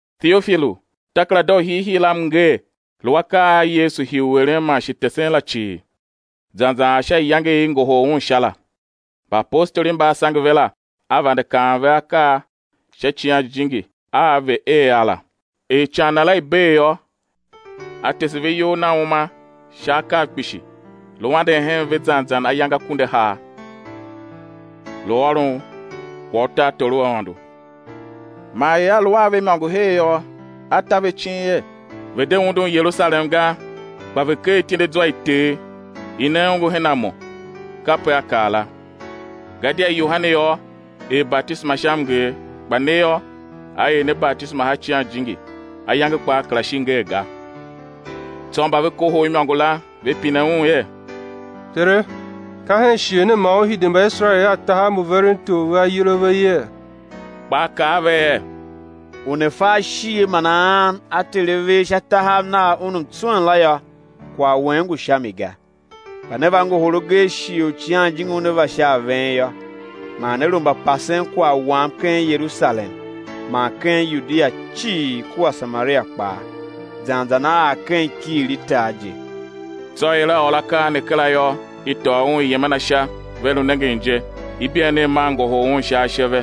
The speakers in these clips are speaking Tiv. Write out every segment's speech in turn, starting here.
Teofilu, takerada u hiihii la m nger, lu akaa a Yesu hii u eren man shi tesen la cii, zan zan ar sha iyange i i ngohol Un Sha la; mbaapostoli mba A sange ve la, A vande kaan ve akaa sha Icighan Jijingi a ve̱ er a la; er ican Na la i bee yô, A tese ve iyol Na uma sha akav kpishi, lu anden hen ve zan zan ayange akunduahar, lu ôron kwagh u tartor u Aôndo. Man er A lu a ve imôngo her yô, A ta ve icin er ve̱ de undun Yerusalem ga, kpa ve̱ kegh ityendezwa i Ter, i ne ongo her a Mo (kape A kaa la.) Gadia Yohane yô, er batisema sha mnger, kpa ne yô, á er ne batisema sha Icighan Jijingi, ayange kpaa kera shi ngee ga. Tsô mba ve kohol imôngo la, ve pine Un er: Tere, ka hen shighe ne man Ú hide Mbaiserael a tahav mbu veren tor ve ayol a ve yee? Kpa A kaa a ve er: U ne fa ashighe man a-an a Ter A ver sha tahav Nav, Un mtswen la yô, kwagh wen ngu sha mi ga. Kpa né va ngohol agee shighe u Icighan Jijingi Una va sha a ven yô, man né lu mbapasen kwagh Wam ken Yerusalem man ken Yudia cii kua Samaria kpaa, zan zan á ar ken ikighir i tar je. Tsô er A ôr akaa ne kera yô, i tôô Un i yem a Na sha; ve lu nengen je, ibeenegh maa ngohol Un sha ashe ve.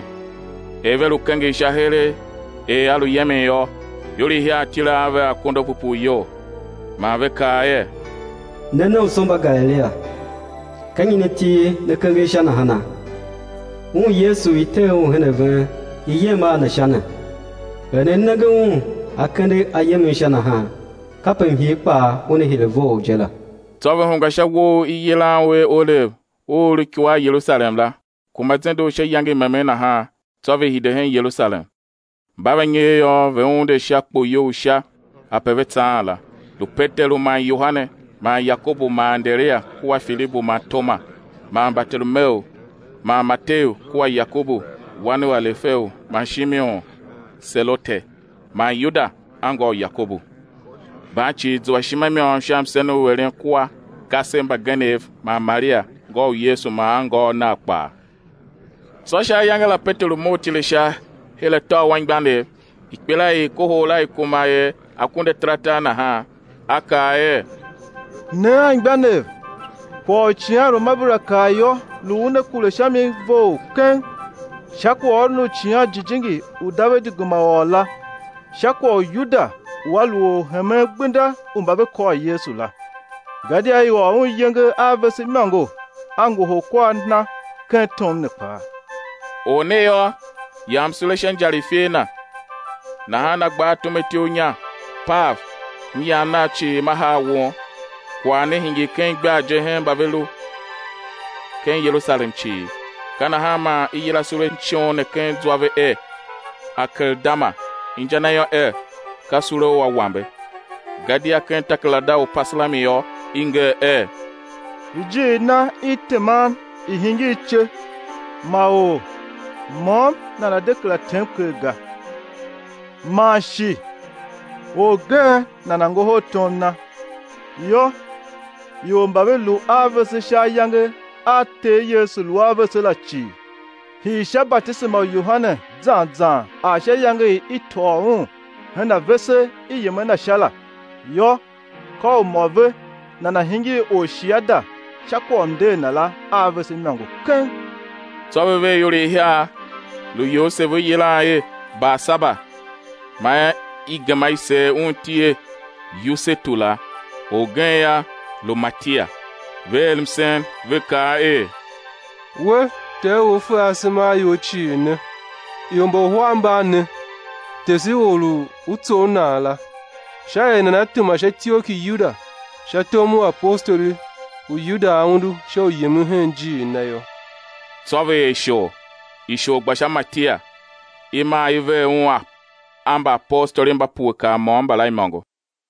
Er ve lu kenger Sha heregh er A lu yemen yô, ior ihiar tile a ve a akondo a pupuu iyol, man ve kaa er: Ne nomso mba Galilia, ka nyi ne til ne kenger Sha nahana? Un Yesu u i tee Un her a ven i yem a Na Sha ne, er ne nenge Un A kende A yemen Sha nahan, kape mhir kpaa Una hire vough je la. Tsô ve hungwa sha uwo u i yilan u er Olev u u lu ikua a Yerusalem la, kuma zende u sha iyange i memen nahan, tsô ve hide hen Yerusalem. Mba va nyer yô, ve unde sha kpoyou u sha ape ve tsaan la, lu Peteru man Yohane man Yakobu man Anderia, kua Filibu man Toma, man Bartolomeu man Mateu kua Yakobu wan u Alefeu man Shimon Selote, man Yuda, anngô u Yakobu. Mban cii zua ishima i môm sha msen u eren kua kasev mbagenev man Maria, ngô u Yesu man angôôv Nav kpaa. Tsô sha ayange la Peteru mough tile sha, her atô u anmgbianev—ikpelaior i i kohol la i kuma er akundu ataratar nahan; a kaa er: Ne anmgbianev, kwagh u icighanruamabera kaa yô, lu u una kure sha mi vough keng, sha kwaghôron u Icighan Jijingi u Davidi gema ôr la, sha kwagh u Yuda u a lu orhemen gbenda u mba ve kôr Yesu la. Gadia i ôr un iyenge a vese imôngo, a ngohol kwar na ken tom ne kpaa. Or ne yô, yam sule sha injar i ifer na, nahan a gba a tume ityough inya, pav, myam nam cii ma haa won. Kwagh ne hingir ken igbar je hen mba ve lu ken Yerusalem cii; ka nahan man i yila sule shon ne ken zwa ve er, Akeldama, inja na yô, er, ka sule u awambe. Gadia ken takerada u Upasalmi yô, i nger er: Ijiir na i teman i̱ hingir ice, ma or môm nana̱ de kera tem ker ga! Man shi: Orgen nana̱ ngohol tom na. Yô, ior mba ve lu a vese sha ayange a Ter Yesu lu a vese la cii, hii sha batisema u Yohane zan zan ar sha iyange i i tôô Un her a vese i yem a Na Sha la; yô, ka u mô ve nana̱ hingir orshiada sha kwagh u mnder Na la a vese imôngo keng. Tsô ve ver ior ihiar; lu Yosev u i yilan er Barsaba, man i gema i seer un iti er Yusetu la, orgen yô, lu Matia. Ve er msen, ve kaa er: We, Ter u U fe asema a ior cii ne, ior mba uhar mban ne, tese or u U tsough nan la, sha er nana̱ tema sha ityough ki Yuda sha tom u apostoli, u Yuda a undu sha u yemen hen ijiir na yô. Tsô ve er ishor, ishor gba sha Matia; i maa i ver un a mbaapostoli mba pue kar môm mbala imôngo.